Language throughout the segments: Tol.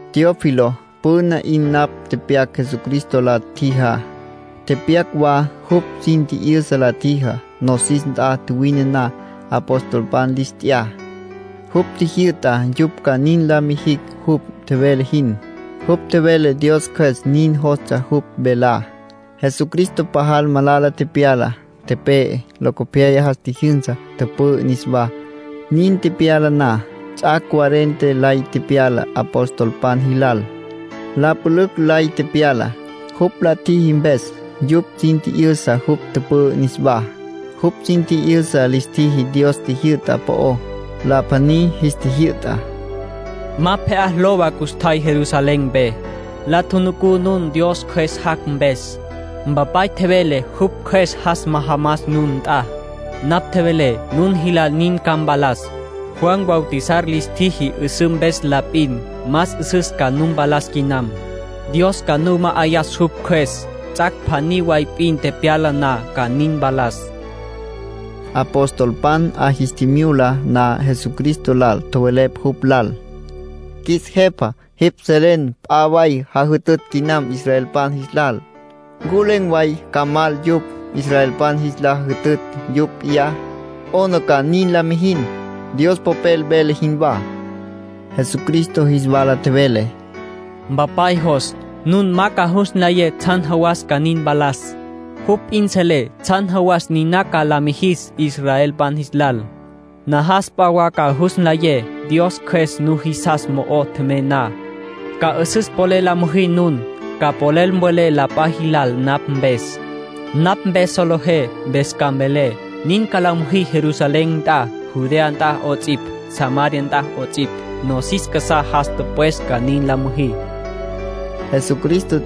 Teófilo, püna 'in napj tepyac Jesucristo la tjijá. Tepyac wa jupj sin tji'yüsa la tjijá. Nosis nt'a tjuwine na, apostolpan lis t'ya. Jupj tjijyü'ta yupj ca nin la mijicj jupj tjevele jin. Jupj tjevele Dios Cjües nin jostsja jupj velá. Jesucristo pajal malala tepyala, tepe'e. Locopyaya jas tjijyünsa, tüpü'ü niswá. Nin tepyala na, ts'ac' cuarenta lay tepyala apostolpan jilal. La pülücj lay tepyala. Jupj la tjiji mpes yupj sin tji'yüsa jupj tüpü'ü niswá. Jupj sin tji'yüsa lis tjiji Dios jyü'ta po'ó. La pjaní jis tjijyü'ta: —Ma pje'á lowa custjay Jerusalén mpe. La tjunucú nun Dios Cjües jac' mpes. Mpapay tjevele jupj Cjües jas majamas nun nt'a. Napj tjevelé nun jilal nin ca mpalas. Juan bautizar lis tjiji 'üsǘ mpes la p'in. Más 'üsüs ca nu mpalas quinam. Dios ca nu ma'ayas jupj Cjües. Ts'ac' pjaní way p'in tepyala na ca nin mpalas —nin tjevele Jesucristo. Apostolpan 'a jis tjimyula na Jesucristo lal, tjowelepj jupj lal: —Qjuis Jepa, jipj selen la p'a way jajütütj quinam israelpan jis lal. ¿Ncu len̈ way ca mal yupj, israelpan jis la jütütj yupj p'iyá? ¿'Ona ca nin la mijin, Dios Popel vele jinwá? Jesucristo jis wala tjevele: —Mpapay jos nun ma ca jus nlayé tsjan jawas ca nin mpalas. Jupj p'in selé tsjan jawas niná ca la mijis israelpan jis lal. Najas p'a wa ca jus nlayé. Dios Cjües nujisas mo'o tjemey na, ca 'üsüs polel la müjí nun. Ca polel mvelé la p'a jilal napj mpes. Napj mpes solejé mpes ca mvelé. Nin ca la müjí Jerusalén nt'a, Judea nt'a 'ots'ipj, Samaria nt'a 'ots'ipj, nosis casá jas tüpwes ca nin la müjí —nin tjevele Jesucristo.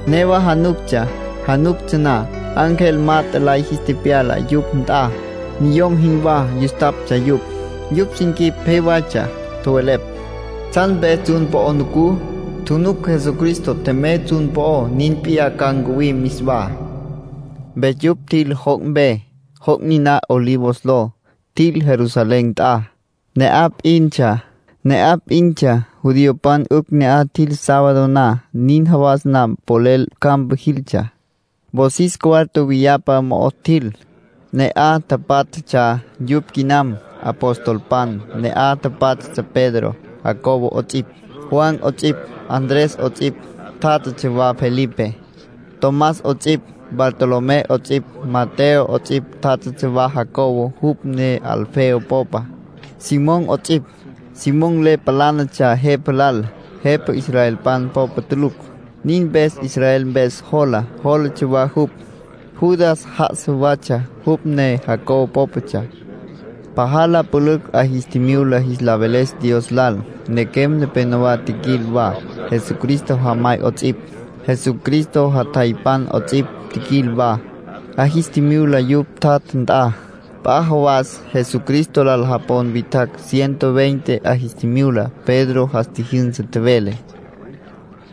Newa januctsja. Januctsja na, ángel mat'e lay jis tepyala yupj nt'a. Niyom jinwá yustaptsja yupj. Yupj sin quip pje waytsja. Tjowelepj: —¿Tsjan mpes tsjun po'o nucú? Tjunuc Jesucristo tjemey tsjun po'ó. Nin p'iyá ca ncuwim niswá —nin tjowelepj. Mpes yupj tjil joc' mpe, joc' niná Olivos ló. Tjil Jerusalén nt'a. Ne'aj p'intsja; judiopan 'ücj ne'aj tjil sábado na, nin jawas ma polel campa jiltsja. Wosis cuarto viyapa mo'o tjil. Ne'aj tapátjatsja yupj quinam, apostolpan. Ne'aj tjátjatsja Pedro, Jacobo 'ots'ipj, Juan 'ots'ipj, Andrés 'ots'ipj. Tjátjatsja wa Felipe, Tomás 'ots'ipj, Bartolomé 'ots'ipj, Mateo 'ots'ipj. Tjátjatsja wa Jacobo (jupj ne Alfeo popa), Simón 'ots'ipj. (Simón le palánatsja jepa lal, jepa israelpan popa tulucj. Nin mpes “Israel Mpes Jola” lotsja wa jupj.) Judas já'asa watsja (jupj ne Jacobo pópatsja). Pajal la pülücj 'a jis tjimyula jis la veles Dios lal. Nequem nepenowá tjiquil wa, Jesucristo jamay 'ots'ipj, Jesucristo jatjaypan 'ots'ipj, tjiquil wa; 'a jis tjimyula yupj tjatja nt'a. P'a jawas Jesucristo lal japon witjacj ciento veinte 'a jis tjimyula. Pedro jas tjijyünsa, tjevele: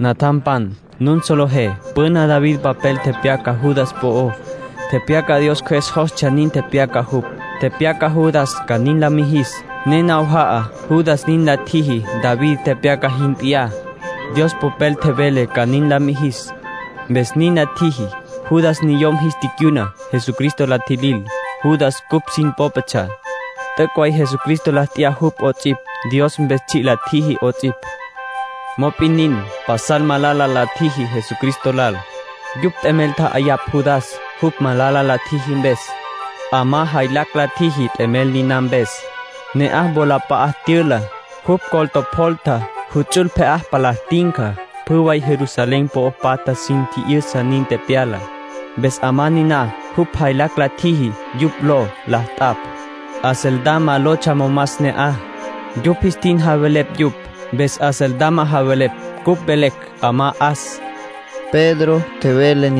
“Natjampan, nun solejé püna David papel tepyaca Judas po'ó. Tepyaca Dios Cjües jostsja nin tepyaca jupj. Tepyaca Judas ca nin la mijis, ne nawaja'a Judas nin la tjiji David tepyaca jin p'iyá. Dios Popel tjevele ca nin la mijis, mpes nin la tjiji. Judas niyom jis ticyuna, Jesucristo la tjilil. Judas cupj sin pópatsja. T'üc' way Jesucristo la t'ya jupj 'ots'ipj, Dios mpes tsji' la tjiji 'ots'ipj. Mop'in nin, pasal malala la tjiji Jesucristo lal. Yupj t'emel tja'ayapj Judas, jupj malala la tjiji mpes. 'Amá jaylacj la tjiji t'emel niná mpes. Ne'aj wolap'a'a tyüla, jupj col tjopjolta. Juts'ul pje'á palá tinca. Pjü way Jerusalén po'o patja sin tji'yüsa nin tepyalá. Mpes 'amá niná jupj jaylacj la tjiji yupj ló la t'apj. Acéldama lotsja momas ne'aj. Yupj jis tin javelepj yupj, mpes Acéldama javelepj. Cupj velecj: ‘'Amá 'As’”, Pedro nin tjevele.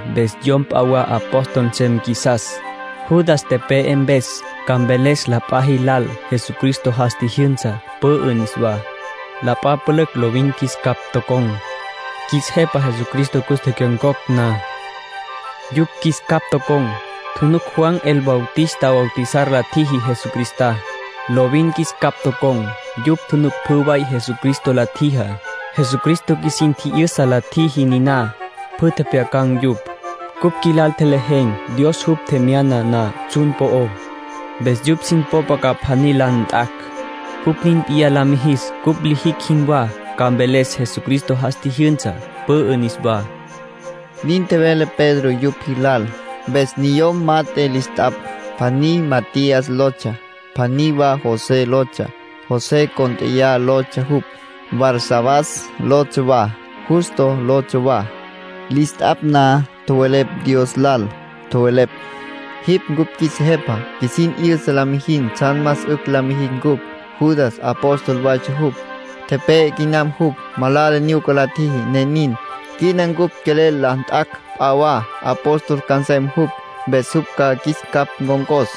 Mpes yom p'a wa apóstol nsem qjuisas, Judas tepe'e mpes. Ca mveles la p'a jilal Jesucristo jas tjijyünsa, pü'ü niswá. La p'a pülücj lovin qjuis capj tocon̈, qjuis Jepa Jesucristo cus tecyon̈cocj na. Yupj qjuis capj tocon̈, tjunuc Juan el Bautista bautizar la tjiji Jesucristá. Lovin qjuis capj tocon̈. Yupj tjunuc pjü way Jesucristo la tjijá. Jesucristo qjuisin tji'yüsa la tjiji na, pjü tjepjyacan̈ yupj. Cupj qjuilal tjelejen̈, Dios jupj tjemyana na tsjun po'ó. Mpes yupj sin popa ca pjaní la nt'acj. Jupj nin p'iyá la mijis cupj lijicj jinwá. Ca mveles Jesucristo jas tjijyünsa, pü'ü niswá”, nin tjevele Pedro yupj jilal. Mpes niyom mat'e lis t'apj. Pjaní Matías lotsja. Pjaní wa José lotsja. José cónt'eya lotsja jupj. Barsabás lotsja wa, Justo lotsja wa. Lis t'apj na, tjowelepj Dios lal. Tjowelepj: “Jipj cupj qjuis Jepa. Qjuisin 'yüsa la mijin tsjan más 'ücj la mijicj cupj. Judas apóstol waytsja jupj. Tepe'e quinam jupj; malala nyuca la tjiji, ne nin. Quina cupj quelel la nt'acj p'a wa, apóstol ca nsem jupj. Mpes jupj ca qjuis capj ncon̈cos.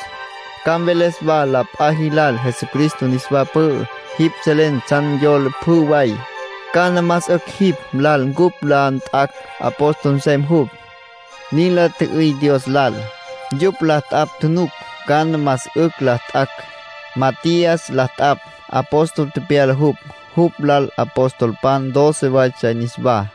Ca mveles wa la p'a jilal Jesucristo niswa pü'ü. Jipj selen tsjan yola pjü way. ¿Cana más 'ücj jipj lal cupj la nt'acj apóstol nsem jupj?” nin la tjü'üy Dios lal. Yupj la t'apj tjunuc cana más 'ücj la nt'acj. Matías la t'apj. Apóstol tepyala jupj. Jupj lal apostolpan doce waytsja niswá.